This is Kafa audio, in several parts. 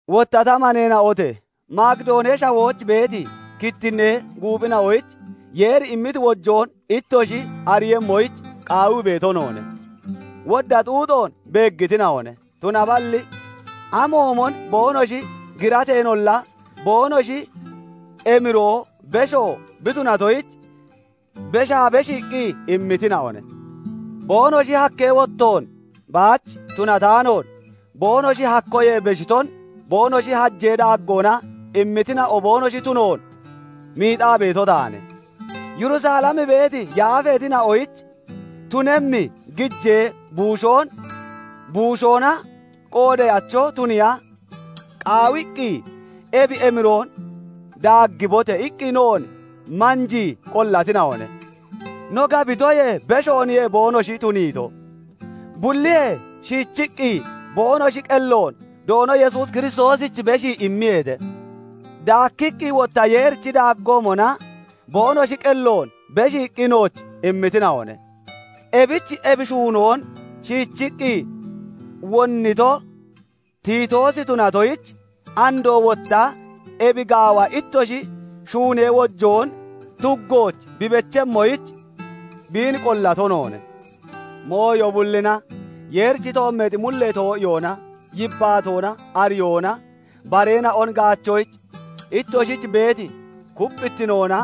Wotta ta maneena'ote! Makidoonee Shawooch beeti kittinnee guuphina'oyich Yeeri immiti wojoon ittoshi ariiyemmoyich qaawii beeto noone. Wodda xuuxoon beeggitina'one; tunaballi amoomon boonoshi girateenolla, boonoshi emiroo besho bi tunatoyich, beshaa beshiiqqi immitina'one. Boonoshi hakkee wottoon baach tunataanoon, boonoshi hakkoyee beshiton boonoshi hajee daaggoona immitina'o boonoshi tunoon miixaa beeto taane; Yerusalem beeti yaafeetina'oyich tunemmi gijee buushoon buushoona qoodeyacho tuniya qaawiqqi, "Ebi emiroon daaggibote!" iqqi noon manjii qollatina'one. No gabitoyee beshooniye boonoshi tuniito; bulliyee shiichiqqi boonoshi qelloon Doono Yesuus Kiristoosich beshii immiyeete; daakkiqqi wotta Yeerichi daaggoomona boonoshi qelloon beshiiqqi nooch immitina'one. Ebich ebi shuunoon shiichiqqi wonnito Tiitoosi tunatoyich, andoo wotta ebi gaawa ittoshi shuunee wojoon tuggooch bi bechemmoyich biin qollato noone. Mooyo bullina, Yeerichi toommeexi mullee too'iyoona, yibbaatoona, ariyoona, bareena'on gaachoyich ittoshich beeti kupphittinoona,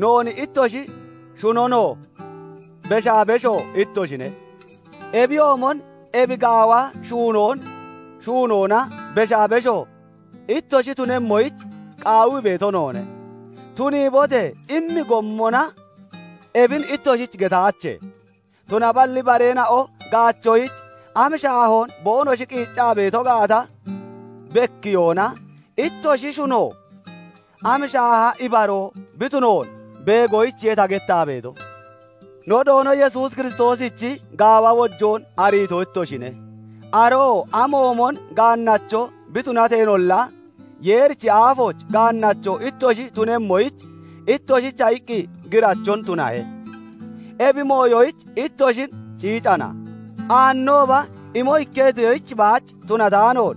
noon ittoshi shunonoo beshaa besho ittoshine; ebiyoomon ebi gaawa shuunoon shuunoona beshaa besho ittoshi tunemmoyich qaawii beeto noone. "Tuniibote!" immi gommona ebin ittoshich getaache; tunaballi bareena'o gaachoyich am shaahoon boonoshi qiiccaa beeto gaata bekkiyoona, ittoshi shuno am shaaha ibaroo bi tunoon beegoyichiye ta gettaa beeto. No Doono Yesuus Kiristoosichi gaawa wojoon ariito ittoshine; aroo amoomon gaannacho bi tunateenolla, Yeerichi aafooch gaannacho ittoshi tunemmoyich, ittoshicha iqqi girachon tunahe. Ebi mooyoyich ittoshin ciicana; aannooba imo ikketoyich baach tunataanoon,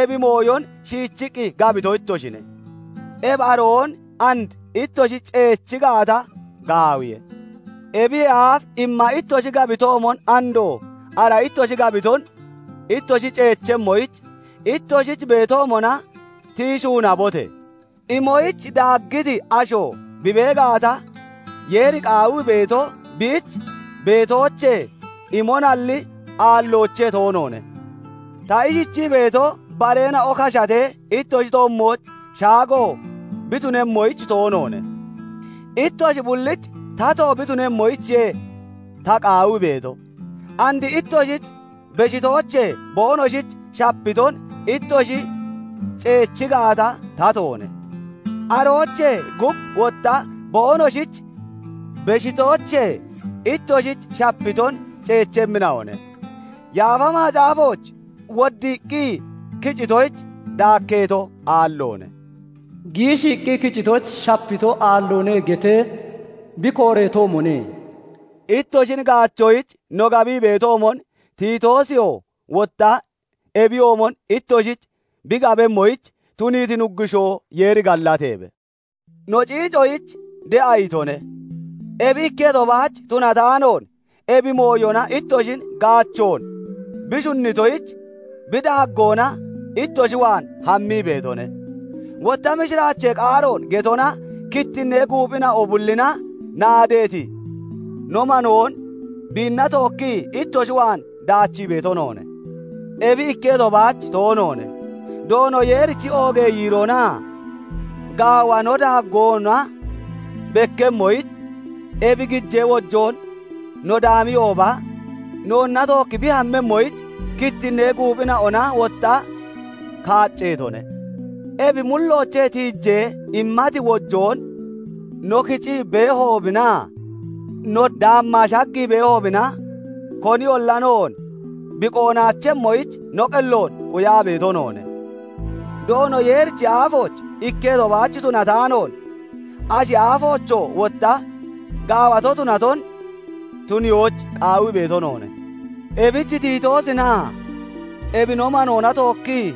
ebi mooyon shiichiqqi gabito ittoshine; ebi aroon and ittoshi ceechi gaata, gaawiye. Ebiyee aaf imma ittoshi gabbitoomon, andoo ara ittoshi gabiton ittoshi ceechemmoyich, ittoshich beetoomona tiyi shuunabote! Imoyich daaggiti asho bi bee gaata, Yeeri qaawii beeto, biich beetoochee imonalli, aalloochee toonoone. Ta ishichii beeto, bareena'o kashatee ittoshi toommooch shaago bi tunemmoyich toonoone; ittoshi bullich tato bi tunemmoyichiye ta qaawii beeto; and ittoshich beshitoochee boonoshich shapiton ittoshi ceechi gaata, tatoone; aroochee gub wotta boonoshich beshitoochee ittoshich shapiton ceechemmina'one. Yaafa Macaafooch Woddiiqqi kicitoyich daakkeeto aalloone; giishiiqqi kicitoyich shapito aalloone getee bi kooreetoomone. Ittoshin gaachoyich no gabii beetoomon Tiitoosiyoo wotta ebiyoomon ittoshich bi gabemmoyich tuniiti Nuggushoo Yeeri gallateebe; no ciicoyich de'a itone; ebi ikketo baach tunataanoon, ebi mooyona ittoshin gaachoon bi shunnitoyich bi daaggoona ittoshi waan hammii beetone. Wotta mishiraachee qaaroon getona kittinnee guuphina'o bullina naadeeti no manoon biinna tookkii ittoshi waan daachii beeto noone; ebi ikketo baach toonoone; Doono Yeerichi oogee yiiroonaa gaawa no daaggoona bekkemmoyich, ebi gijee wojoon no daamiyooba noonna tookki bi hammemmoyich kittinnee guuphina'ona wotta kaacceetone. Ebi mulloochee tiijee immati wojoon no kicii beehoobinaa no daammaa shaggii beehoobina, koniyolla noon bi qoonaachemmoyich no qelloon quyaa beeto noone. Doono Yeerichi aafooch ikketo baach tunataanoon, ashi aafoochoo wotta gaawato tunaton tuniyoyich qaawii beeto noone. Ebich Tiitoosinaa ebi no manoona tookkii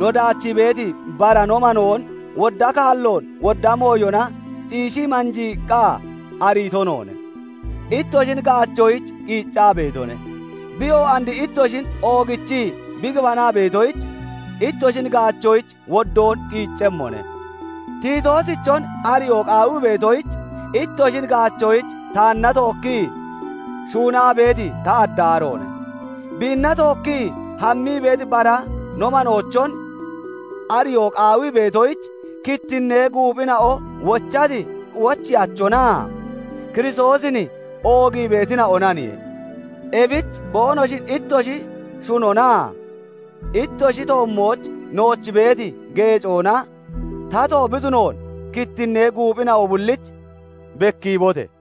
no daachii beeti bara no manoon wodda kaalloon wodda mooyona xiishii manjiiqqa ariito noone; ittoshin gaachoyich qiiccaa beetone. Biyoo and ittoshin oogichii bi gibanaa beetoyich, ittoshin gaachoyich woddoon qiiccemmone; Tiitoosichon ariyoo qaawii beetoyich, ittoshin gaachoyich taanna tookkii shuunaa beeti ta addaaroone; biinna tookkii hammii beeti bara no maneena'ochon ariyoo qaawii beetoyich, kittinnee guuphina'o wochati wocheyachina'onaa Kiristoosin oogii beetina'onaniye. Ebich boonoshin ittoshi shunonaa ittoshi toommooch nooch beeti geecoona tato bi tunoon kittinnee guuphina'o bullich bekkiibote!